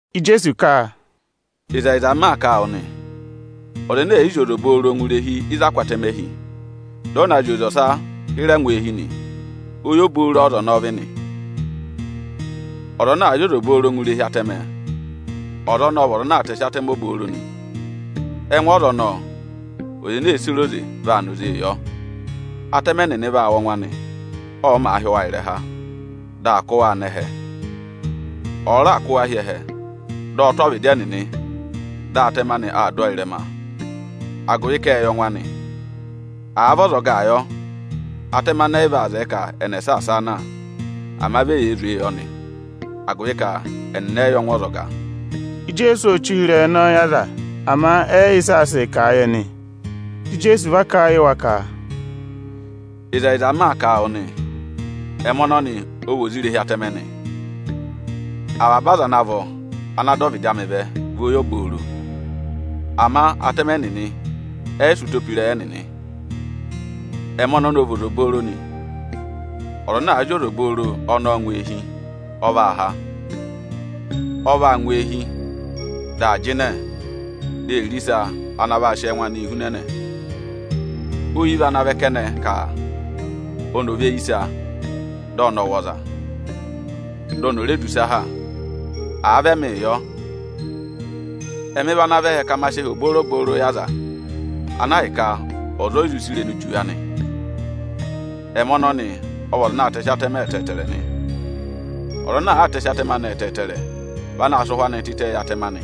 Ijeesu ka, “Ịzẹyịza m maa kà a wụ nị, ọza ẹnẹ ẹ̀ yị zị oze obooro ngụ irehi ịzị aā kụ́ atẹmẹ hi, dị ọ na zị oze ọsa hịrẹ ngụ eehi nị, oyi obooro ọ́za ọnọọ vị nị. Ọza ana àa zị oze obooro ngụ irehi atẹmẹ, ọza ọnọọ ọ vị ọza ana aa tẹsị atẹmẹ obooro nị. Ẹngụ ọza ọnọọ, ọza ene ee sere oze vaa na oze yọ. Atẹmẹ nịnị vaa wụ́ ọngwẹ anị, ọ màa hị́ wa ịrẹha, dị aa kụ́ waa nọ ẹhẹ. Ọ̀ọ raà kụ́ wa hi ẹhẹ, dị ọ tụ́ ọvịdị ẹnịnị, dị atẹmẹ anị aa dụ ọọ ịrẹma, agụvị ka ệ yẹ ọngwẹ anị. Àa vị ọzọgaa yọ, atẹmẹ anị ẹ yị vaa zẹẹ ka ẹnị ẹ̀ saasa a na, ama vi eyee zwee yọ nị, agụvị ka ẹnịnị ẹ yị yẹ ọngwẹ ọzọga.” Ijeesu ô che ụhịrẹyị ọnọọ yị aza, ama ẹ yị yẹ ịsị aa sịị kà a yị ẹnị. Dị Ijeesu va kà a yị wa ka, “Ịzẹyịza m maa kà a wụ nị, ẹmị ọnọnị ọ vị oze irehi atẹmẹ nị. Avaba aza ana vọ ana dọ ọvịdị amị vẹ, vị oyi obooro. Ama atẹmẹ nịnị ẹ yị sị ụtọ pe ịrẹyị ẹnịnị. Ẹmị ọnọnị ọ vị oze obooro nị. Ọza ana àa zị oze obooro ọnọọ ngụ eehi, ọ vaa há. Ọ vaa ngụ eehi, dị aa jịnẹ, di ee re ịsa ana vaa sị ẹngụ anịị hunẹnẹ. Oyi vị anaā vẹ kẹnẹ ka oni ò ve yi ịsa, dị ọnị ọ̀ wụ̀ ọza, di oni ò re du ịsa ha. Àa vị ẹmịị yọ, ẹmị vị ana vẹ ẹhẹ ka ma sị ẹhẹ obooro-obooro yị aza, ana ahịka ọza o yi zụ sị irenu juwe anị. “Ẹmị ọnọnị ọ vị ọza anaā tẹsị atẹmẹ ẹtẹẹtẹrẹ nị. Ọza anaā tẹsị atẹmẹ anị ẹtẹẹtẹrẹ vị anaā sịị ụhwẹ anịị tịtẹẹ yị atẹmẹ anị.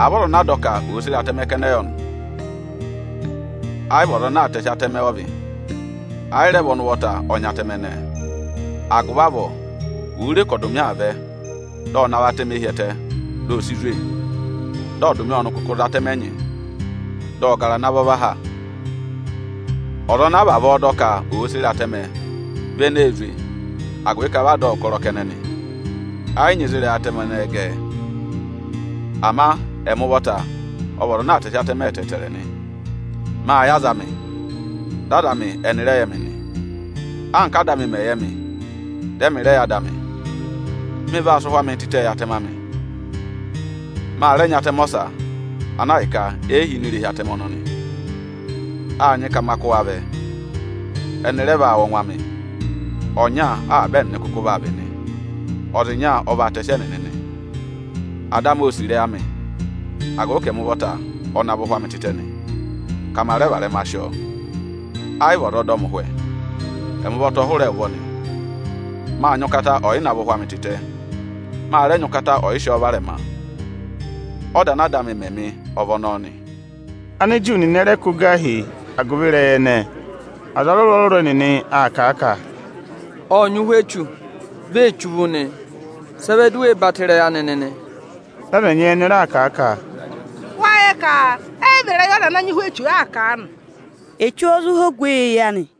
Àa vị ọza ana a dọ ka òo sere atẹmẹ kẹnẹ yọ nị, ẹ yị vị ọza anaā tẹsị atẹmẹ ọ vị, ẹ yị rẹ vị ọnị ụvọta ọ nyị atẹmẹ ẹnẹẹ. Agụvị avọọ òo re ka akatapooro aa vẹ, dị ọ navọ atẹmẹ hi ẹtẹ, di o si zwe. Dị akatapooro ọnị kụkụ za atẹmẹ ẹnyị, dị ọ gara ana vọ và ha. Ọza ana a vavọọ dọ ka òo sere atẹmẹ vị eneē zwe, agụvị ka vị a dọ ọ ụkọrọ kẹnẹ nị; ẹ yị nyị ịzị ịrẹyị atẹmẹ ẹnẹẹ gẹ ẹ. Ama ẹmị ụvọta ọ vị ọza anaā tẹsị atẹmẹ ẹtẹẹtẹrẹ nị. Mâ yẹ aza amị, dị aza amị ẹnị rẹ yẹ ẹmị nị, anka Áda amị mẹ̀ yẹ mị, dị ẹmị rẹ yẹ Ada amị. Mị vaa sị ụhwẹ amịị tịtẹẹ yị atẹmẹ amị. Ma rẹ nyị atẹmẹ ọsa, ana ahịka e yi hi ini irehi atẹmẹ ọnọnị. Â nyị ka ma kụ́ wa vẹ, ẹnị rẹ vaa wụ́ ọngwẹ amị. Ọnya avaba ẹnịnị kụkụ vaa vị nị, ọza ịnya ọ vaa tẹsị ẹnịnị nị. Ada amị ô sì ịrẹyị amị, agụvị ka ẹmị ụvọta ọ navọ ụhwẹ amị tịtẹ nị, ka ma rẹ varẹma sị ọọ. Ẹ yị vị ọza aa dọ mị ụhwẹ, ẹmị ụvọta ọ hụrẹ ẹ ụvọ nị. Mâ nyị ụkata ọyịnavọ ụhwẹ amị tịtẹ, ma rẹ nyị ụkata ọyị sị ọọ varẹma. Ọda ana Ada amị mẹ mị ọ vị ọnọọ nị.” Aniju nịnị ẹ rẹ kụ́ gà hi agụvị ịrẹyị ẹnẹẹ. Aza ọrụrụ-ọrụrụ ẹnịnị aa kà a ka, “Ộ nyị ụhwẹ echu, vi ee che uvu nị! Sị ẹ vẹ di u wee batọ ịrẹyị anị nịnị?” Dị aza ẹnyị ẹnị raa kà a ka, “Wáá yẹ ka ẹ yị vị ịrẹyị ọza ana nyị ụhwẹ echu aa kà aanị! Echu ọ́ọ́ zụ há ogweyi eyi anị?”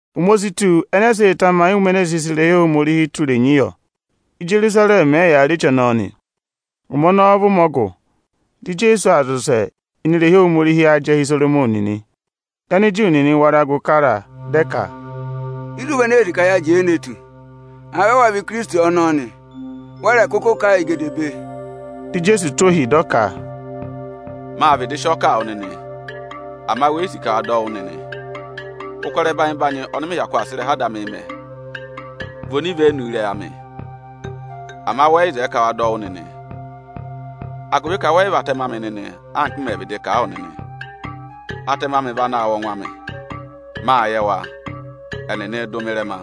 Ụmẹ o si tù ẹnẹ ẹ sịị̄ tamayị ụmẹ ene e sị sị irehi Ohomorihi tụ́ irenyi yọ. Ijerusarẹmị ẹ yàā rị eche ọnọọ nị. Ụmẹ ọnọọ vị ụmẹ ọgụ. Dị Ijeesu aa zị ụsẹ ini irehi Ohomorihi ájẹhẹ Isoromọnị nị. Dị Aniju nịnị wara gụ kara a, dị ẹ ka, “Ịzị u vị ene ee sì ka yaa jẹẹ ne tù? Àa vị ẹwa vị Ikirisiti ọnọọ nị, wẹ rẹ̀ kụkụ kà a yị gedebee!” Dị Ijeesu tụ́ ohi, dị ọ ka, “Mâ vịdị sị ọọ kà a wụ nịnị, ama we yi sì ka wa dọ wụ́ nịnị. Ụkọrọ ẹbanyị-ẹbanyị ọnị mị hyakụ aa sị ịrẹha Ada amịị mẹ, vị onivenu ịrẹyị amị. Ama wẹ yị zẹẹ ka wa dọ wụ́ nịnị, agụvị ka wẹ yị vị atẹmẹ amị nịnị, anka m mẹ̀ vịdị kà a wụ nịnị. Atẹmẹ amị vị anaā wụ́ ọngwẹ amị, mâ yẹ wa, ẹnịnịị̄ dụ mị ịrẹma.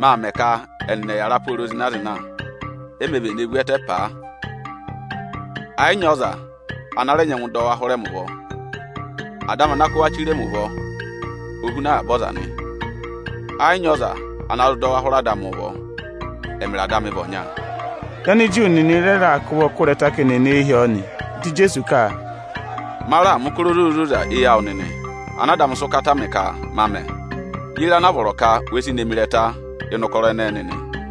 Maa mẹ ka ẹnịnị ẹ̀ yàra pooro zịna-zịna; e mē vene vu ẹtẹ paa, ẹ yị nyị ọza ana rẹ nyẹngụ dọ wa hụrẹ mị ụvọ. Ada amị ana kụ́ wa chire mi ụvọ, o huna avaba ọza nị; ẹ yị nyị ọza ana zụ dọ wa hụrẹ Ada amị ụvọ. Ẹmịrị Ada amị vị ọnya.” Dị Aniju nịnị rẹ raà kụ́ ụvọ kụ́ ịrẹta ka eni è ne e hi ọọ nị. Dị Ijeesu ka, “Ma raà mẹ̀ ụkọrọ ozoza-ozoza éyi awụ nịnị ana Ada amị sị ụkata mị ka ma mẹ. Ye re ana a vọrọ ka we si ne mi ịrẹta ịnị ụkọrọ ẹnẹẹ nịnị?”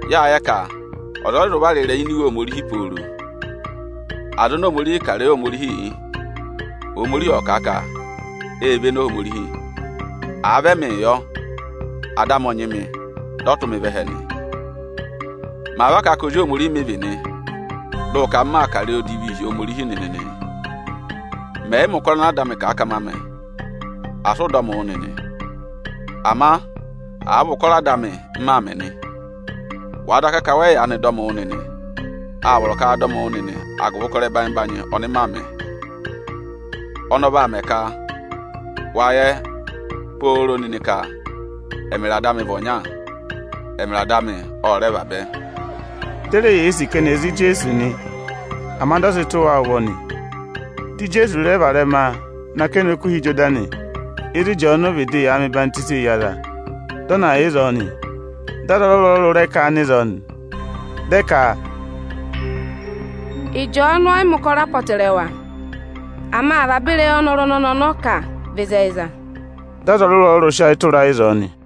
Yâ yẹ ka ọza ọ yị zụ vara ịrẹyị ini Iwe Ohomorihi pooro. Aza oni Ohomorihi kà ịrẹyị Ohomorihii yị, Ohomorihi ộ kà a ka ê véné Ohomorihi. Àa vị ẹmịị yọ, Ada amị ọ nyị mị, dị ọ tụ́ mị vẹ ẹhẹ nị. Màa va kà a ka Ozi Ohomorihi mị vị nị, dị ụ ka m maa kà ịrẹyị odivii hi Ohomorihi nịnị nịị? Mẹ̀ yị mẹ̀ ụkọrọ ana Ada amị ka ma mẹ, asị ụ dọ mị wụ́ nịnị! Ama àa vị ụkọrọ Ada amị m maa mẹ̀ nị, wàa daka ka wẹ yị yaanị dọ mị wụ́ nịnị, â vọrọ ka wa dọ mị wụ́ nịnị agụvị ụkọrọ ẹbanyị-ẹbanyị ọnị maa mẹ̀. Ọnị ọ vaa mẹ ka wa yẹ pooro nịnị ka ẹmịrị Ada amị vị ọnya, ẹmịrị Ada amị ọ rẹ vabẹ.” Di e re yee sì ka ẹnị ẹ̀ za Ijeesu nị, ama dị ọ sị tụ̀ wa ụvọ nị. Dị Ijeesu rẹ varẹma nọ akẹnẹ Okuha Ịjọdanị, ịzị Ịjọọnụ vịdị yà aa mẹ ọyịhwenyii yị aza, dị ọ na yà ịzọọ nị. Dị aza ọrụrụ-ọrụrụ rẹ ká a nọ ịzọọ nị. Dị ẹ ka, “Ịjọọnụ ọ yị mẹ̀ ụkọrọ apọtẹrẹwa, ama avaba ịrẹyị ọnị ọnọrụ ọnọnị kà vị ịzẹyịza.” Dị aza ọrụrụ-ọrụrụ sị ayị tụra a ịzọọ nị.